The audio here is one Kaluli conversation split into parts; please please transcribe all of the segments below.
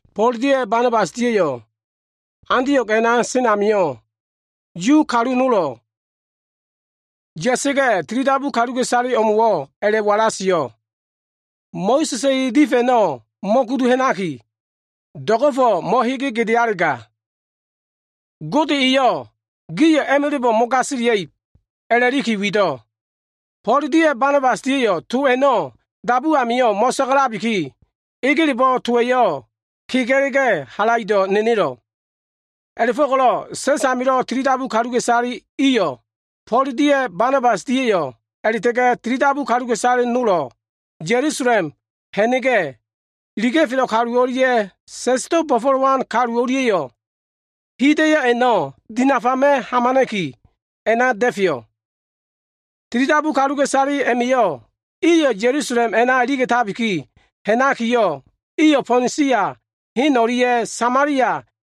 Fo꞉l dia꞉ Banabas dia꞉yo꞉ Antio꞉g a꞉na sen amio꞉, Yudia kalu nolo꞉ ya꞉sa꞉ga꞉, tilidabu kaluka꞉isale imo꞉wo꞉ a꞉la꞉walasio꞉, “Mo꞉sa꞉sa꞉ ele saefa꞉ a꞉no꞉ mo꞉kudu ha꞉naki, do꞉go꞉fo꞉ mo꞉hege gedealega, Gode eyo꞉ gio꞉ a꞉ma꞉la꞉bo꞉ mo꞉gasilia꞉ib,” a꞉la꞉liki wido꞉. Fo꞉l dia꞉ Banabas dia꞉yo꞉ to a꞉no꞉ dabu amio꞉ mo꞉sagalabiki, egelebo꞉ towa꞉yo꞉ kega꞉la꞉ga꞉yo꞉ halaido꞉ nenelo꞉. A꞉la꞉fo꞉ko꞉lo꞉ sa꞉s amilo꞉ tilidabu kaluka꞉isale iliyo꞉ Fo꞉l dia꞉ Banabas dia꞉yo꞉ a꞉la꞉ta꞉ga꞉ tilidabu kalu nolo꞉lo꞉ Ya꞉lusalem ha꞉na꞉ga꞉yo꞉, iliga꞉felo꞉ kalu o꞉lia꞉ sa꞉sdo꞉ bo꞉fo꞉lowan kalu nol o꞉lia꞉yo꞉, hida꞉yo꞉ a꞉no꞉ dinafama꞉ hamana꞉ki, a꞉na da꞉feyo꞉. Tilidabu kaluka꞉isale i a꞉ma꞉yo꞉ iyo꞉ Ya꞉lusalem a꞉na iliga꞉fo꞉. Iyo꞉ Fonisia hen o꞉lia꞉ Samalia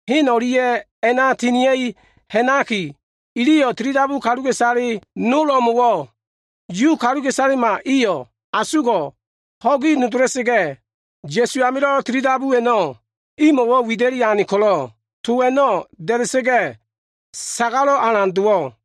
hen o꞉lia꞉ a꞉na tinia꞉li ha꞉nakiyo꞉, iliyo꞉ tilidabu kaluka꞉isale nol o꞉mo꞉wo꞉ Yu kaluka꞉isalema iyo꞉ asugo꞉ ho꞉gi nodola꞉sa꞉ga꞉, Ya꞉su amilo꞉ tilidabu a꞉no꞉ imo꞉wo꞉ wida꞉li ane ko꞉lo꞉, to a꞉no꞉ da꞉da꞉sa꞉ga꞉ sagalo꞉wo꞉ alan dowo꞉.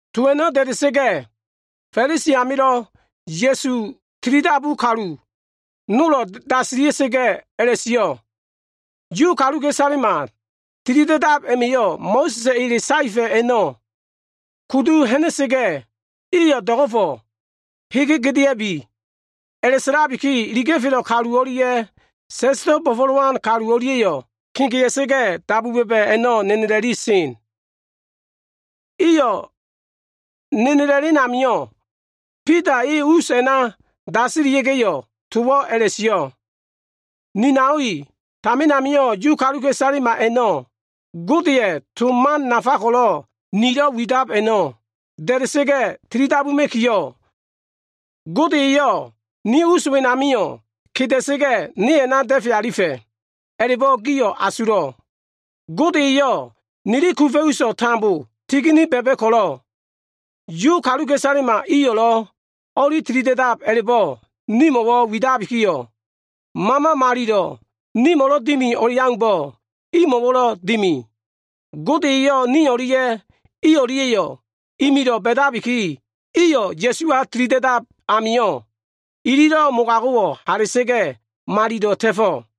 To a꞉no꞉ da꞉da꞉sa꞉ga꞉, Fa꞉lisi amilo꞉ Ya꞉sulo꞉ tilidabu kalu nolo꞉ dasilia꞉ga꞉yo꞉ a꞉la꞉sio꞉, “Yu kaluka꞉isalema tilida꞉dab a꞉ma꞉yo꞉ Mo꞉sa꞉sa꞉ ele saefa꞉ a꞉no꞉ kudu ha꞉nakiyo꞉, iyo꞉ do꞉go꞉fo꞉ hege gedea꞉bi.” A꞉la꞉sa꞉labiki, iliga꞉felo꞉ kalu o꞉lia꞉ sa꞉sdo꞉ bo꞉fo꞉lowan kalu o꞉lia꞉yo꞉ kegea꞉sa꞉ga꞉, dabu ba꞉ba꞉ a꞉no꞉ nenela꞉li sen. Iyo꞉ nenela꞉len amio꞉, Bida e us a꞉na dasilia꞉ga꞉yo꞉ towo꞉ a꞉la꞉sio꞉, “Ni nao i, tamin amio꞉ Yu kaluka꞉isalema a꞉no꞉ Godeya꞉ to nafa ko꞉lo꞉ nilo꞉ widab a꞉no꞉ da꞉da꞉sa꞉ga꞉ tilidabuma꞉kiyo꞉, Gode eyo꞉ ni us wenamio꞉ keda꞉sa꞉ga꞉ ne a꞉na da꞉fe alifa꞉, a꞉la꞉bo꞉ gio꞉ asulo꞉. Gode eyo꞉ nili kufa꞉ uso꞉ tambo tigini ba꞉ba꞉ ko꞉lo꞉, Yu kaluka꞉isalema iyo꞉lo꞉ o꞉li tilida꞉dab a꞉la꞉bo꞉ nimo꞉wo꞉ widakiyo꞉, Mama Malilo꞉ ko꞉lo꞉ nimo꞉lo꞉ dimi o꞉leaumbo꞉, imo꞉wo꞉lo꞉ dimi. Gode eyo꞉ ni o꞉lia꞉ i o꞉lia꞉yo꞉ imilo꞉ ba꞉dabiki, iyo꞉ Ya꞉suwa tilida꞉dab amio꞉, ili mogago꞉wo꞉ hala꞉sa꞉ga꞉, malilo꞉ ta꞉fo꞉.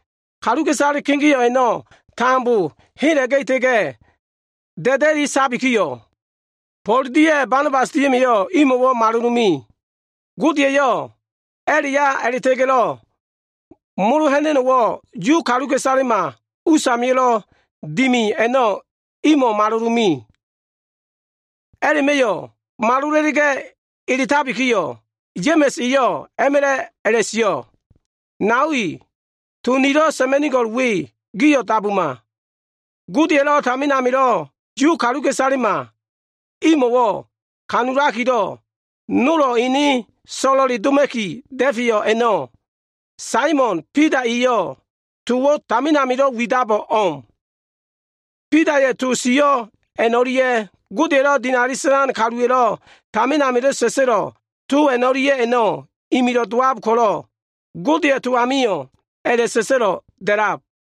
Kaluka꞉isale kegeo꞉ a꞉no꞉ tambo hela꞉ta꞉ga꞉, da꞉da꞉li sabikiyo꞉, Fo꞉l dia꞉ Banabas dia꞉ma꞉yo꞉ imo꞉wo꞉ malolome. Gode eyo꞉ a꞉la꞉ya a꞉la꞉ta꞉ga꞉lo꞉ molo ha꞉na꞉no꞉wo꞉ Yu kaluka꞉isalema usamilo꞉ dimi a꞉no꞉ imo꞉ malolome. A꞉la꞉ma꞉yo꞉ malola꞉la꞉ga꞉ eletabikiyo꞉, Ya꞉ma꞉s eyo꞉ a꞉ma꞉la꞉yo꞉ a꞉la꞉sio꞉, “Nao i, to nilo꞉ sa꞉ma꞉nigo꞉l we, gio꞉ dabuma. Godeya꞉lo꞉ tamin amilo꞉ Yu kaluka꞉isalema imo꞉wo꞉ kanulakilo꞉, nolo꞉ ene so꞉lo꞉le doma꞉ki da꞉feyo꞉ a꞉no꞉, Saimon Bida eyo꞉ towo꞉ tamin amilo꞉ widabo꞉ o꞉m. Bidaya꞉ to sio꞉ a꞉no꞉lia꞉, Godeya꞉lo꞉ dinali sa꞉lan kaluwa꞉lo꞉ tamin amilo꞉ sa꞉sa꞉lo꞉ to a꞉no꞉lia꞉yo꞉ imilo꞉ dowab ko꞉lo꞉, Godeya꞉ to amio꞉ a꞉la꞉sa꞉sa꞉lo꞉ da꞉lab,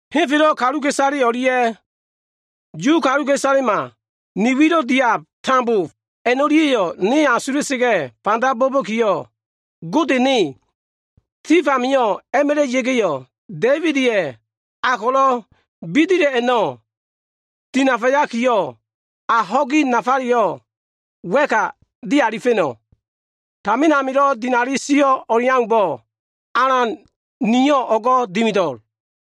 “‘Henfelo꞉ kaluka꞉isale o꞉lia꞉, Yu kaluka꞉isalema ni wilo꞉ diab tambo a꞉no꞉lia꞉yo꞉, ne asula꞉sa꞉ga꞉ fanda bo꞉ba꞉kiyo꞉, Gode ne, tif amio꞉ a꞉ma꞉la꞉ ya꞉ga꞉yo꞉, Da꞉ibida꞉ a ko꞉lo꞉ bidila꞉ a꞉no꞉ dinafayaki, a ho꞉gi nafaleyo꞉ wa꞉ka a꞉dialifa꞉no꞉. Tamin amilo꞉ dinali sio꞉ o꞉leaumbo꞉, Alan Niyo꞉ o꞉go꞉ dimido꞉l.’”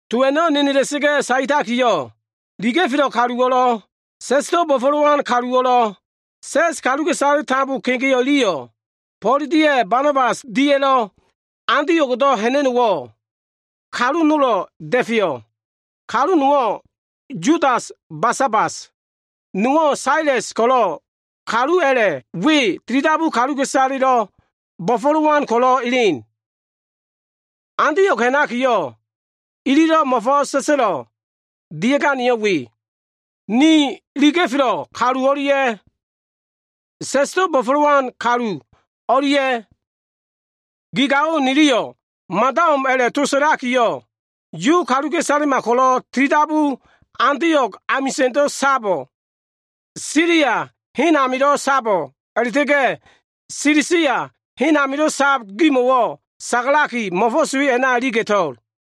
To a꞉no꞉ nenela꞉sa꞉ga꞉ saetakiyo꞉, iliga꞉felo꞉ kaluwo꞉lo꞉, sa꞉sdo꞉ bo꞉fo꞉lowan kaluwo꞉lo꞉, sa꞉s kaluka꞉isale tambolo꞉ kegeo꞉ iliyo꞉, Fo꞉l dia꞉ Banabas dia꞉lo꞉ Antio꞉gdo꞉ ha꞉na꞉no꞉wo꞉, kalu nolo꞉ da꞉feyo꞉. Kalu nowo꞉ Yudas Basabas, nowo꞉ Sales ko꞉lo꞉ kalu a꞉la꞉ we, tilidabu kaluka꞉isalelo꞉ bo꞉fo꞉lowan ko꞉lo꞉ elen. Antio꞉g ha꞉nakiyo꞉, ililo꞉ mo꞉fo꞉s sa꞉sa꞉lo꞉ dia꞉ganeyo꞉ we. Ni iliga꞉felo꞉ kalu o꞉lia꞉ sa꞉sdo꞉ bo꞉fo꞉lowan kalu o꞉lia꞉ gi gao niliyo꞉ mada o꞉m a꞉lo꞉ to sa꞉laki, Yu kaluka꞉isalema ko꞉lo꞉ tilidabu, Antio꞉g amisa꞉ndo꞉ sabo꞉, Silia hen amilo꞉ sabo꞉, a꞉la꞉ta꞉ga꞉ Silisia hen amilo꞉ sab gimo꞉wo꞉ sagalaki, mo꞉fo꞉s we a꞉na iliga꞉to꞉l.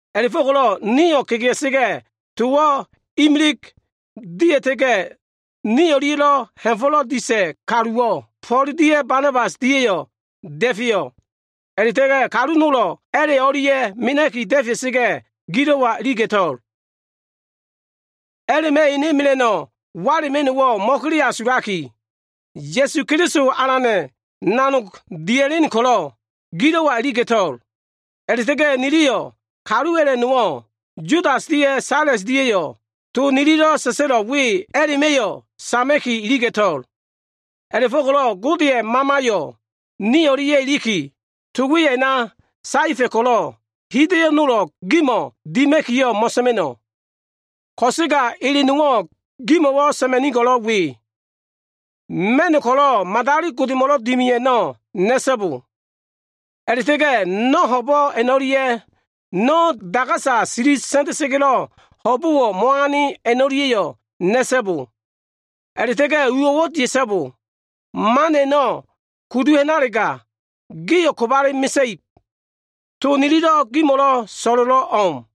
A꞉la꞉fo꞉ko꞉lo꞉ nio꞉ kegea꞉sa꞉ga꞉, towo꞉ imilig dia꞉ta꞉ga꞉, ni o꞉lia꞉lo꞉ ha꞉fo꞉lo꞉ disa꞉ kaluwo꞉ Fo꞉l dia꞉ Banabas dia꞉yo꞉ da꞉feyo꞉. A꞉la꞉ta꞉ga꞉ kalu nolo꞉, a꞉la꞉ o꞉lia꞉ mena꞉ki da꞉fea꞉sa꞉ga꞉, gilo꞉wa iliga꞉to꞉l. A꞉la꞉ma꞉ ene mela꞉no꞉ wala꞉ma꞉no꞉wo꞉ mo꞉keleasulaki, Ya꞉su Keliso Alana꞉ nanog dimida꞉len ko꞉lo꞉ gilo꞉wa iliga꞉to꞉l. A꞉la꞉ta꞉ga꞉ niliyo꞉ kalu a꞉la꞉ nowo꞉, Yudas dia꞉ Sales dia꞉yo꞉, to nililo꞉ sa꞉sa꞉lo꞉l we a꞉la꞉ma꞉yo꞉lo꞉ sama꞉ki iliga꞉to꞉l. A꞉la꞉fo꞉ko꞉lo꞉ Godeya꞉ Mamayo꞉ ni o꞉lia꞉ iliki, to we a꞉na saefa꞉ ko꞉lo꞉, hida꞉yo꞉ nolo꞉ gimo꞉ dima꞉kiyo꞉ mo꞉sa꞉ma꞉no꞉. Ko꞉sega ele nowo꞉ gimo꞉lo꞉ sa꞉ma꞉nigo꞉lo꞉ we. Ma꞉no꞉ ko꞉lo꞉ madali godemo꞉lo꞉ dimiab a꞉no꞉ na꞉so꞉bo. A꞉la꞉ta꞉ga꞉ no꞉ ho꞉bo꞉ a꞉no꞉lia꞉, no꞉wo꞉ dagasa sili sa꞉nda꞉sa꞉ga꞉lo꞉ ho꞉bo꞉wo꞉ mo꞉ane a꞉no꞉lia꞉yo꞉ na꞉so꞉bo. A꞉la꞉ta꞉ga꞉ uwo꞉wo꞉ dia꞉so꞉bo. Man a꞉no꞉ ko꞉lo꞉ kudu ha꞉nalega, gio꞉ kobale mesa꞉ib. To nililo꞉ gimo꞉lo꞉ so꞉lo꞉lo꞉ o꞉m.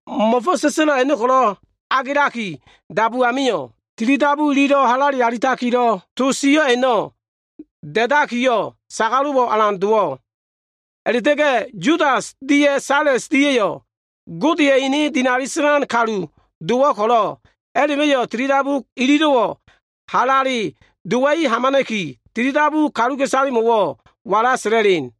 Mo꞉fo꞉s sa꞉sa꞉lo꞉ a꞉no꞉ ko꞉lo꞉ agelaki dabu amio꞉, tilidabu ililo꞉ halale alitakilo꞉ to sio꞉ a꞉no꞉ da꞉dakiyo꞉, sagalo꞉wo꞉ alan dowo꞉. A꞉la꞉ta꞉ga꞉ Yudas dia꞉ Sales dia꞉yo꞉ Godeya꞉ ene dinali sa꞉lan kalu dowo꞉ ko꞉lo꞉, a꞉la꞉ma꞉yo꞉ tilidabu ililo꞉wo꞉ halale dowa꞉i hamana꞉ki, tilidabu kaluka꞉isalemo꞉wo꞉ to a꞉no꞉ wala sa꞉la꞉len.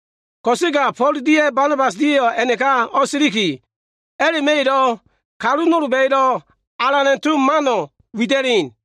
Ko꞉sega Fo꞉l dia꞉ Banabas dia꞉yo꞉ a꞉naka o꞉siliki, a꞉la꞉ma꞉yo꞉lo꞉ kalu nolba꞉yo꞉lo꞉ Alana꞉ to mano꞉ wida꞉len.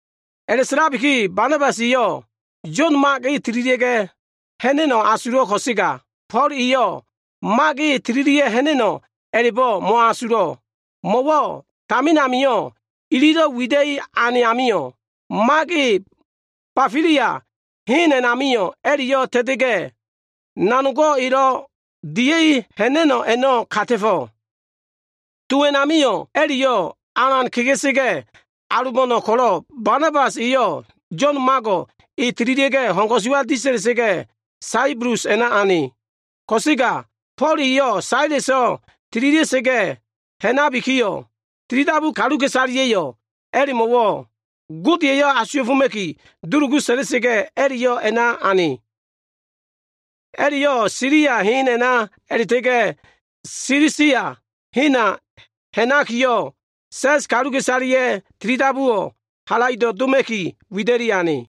A꞉la꞉sa꞉labiki, Banabas eyo꞉ Yo꞉n Mago꞉ tililia꞉ga꞉ ha꞉na꞉no꞉ asulo꞉ ko꞉sega, Fo꞉l eyo꞉ Mak e tililia꞉ ha꞉na꞉no꞉ a꞉la꞉bo꞉ mo꞉asulo꞉, mo꞉wo꞉ tamin amio꞉ ililo꞉ wida꞉i ane amio꞉, Mak e Bafilia hen a꞉namio꞉ a꞉la꞉yo꞉ ta꞉ta꞉ga꞉, nanogo꞉ elo꞉ dia꞉i ha꞉na꞉len a꞉no꞉ kata꞉fo꞉. To a꞉namio꞉ a꞉la꞉yo꞉ alan kega꞉sa꞉ga꞉, alobo꞉no꞉ ko꞉lo꞉, Banabas eyo꞉ Yo꞉n Mago꞉ e tililia꞉ga꞉, ho꞉n ko꞉suwa disa꞉la꞉sa꞉ga꞉, Saibulus a꞉na ane. Ko꞉sega Fo꞉l eyo꞉ Saleso꞉ tililia꞉ga꞉ ha꞉nabikiyo꞉, tilidabu kaluka꞉isaleya꞉yo꞉ a꞉la꞉mo꞉wo꞉ Gode eyo꞉ asuwa꞉foma꞉ki dulugu sa꞉la꞉sa꞉ga꞉, a꞉la꞉yo꞉ a꞉na ane. A꞉la꞉yo꞉ Silia hen a꞉na a꞉la꞉ta꞉ga꞉ Silisia hena ha꞉nakiyo꞉, sa꞉s kaluka꞉isaleya꞉ tilidabuwo꞉ halaido꞉ doma꞉ki, wida꞉li ane.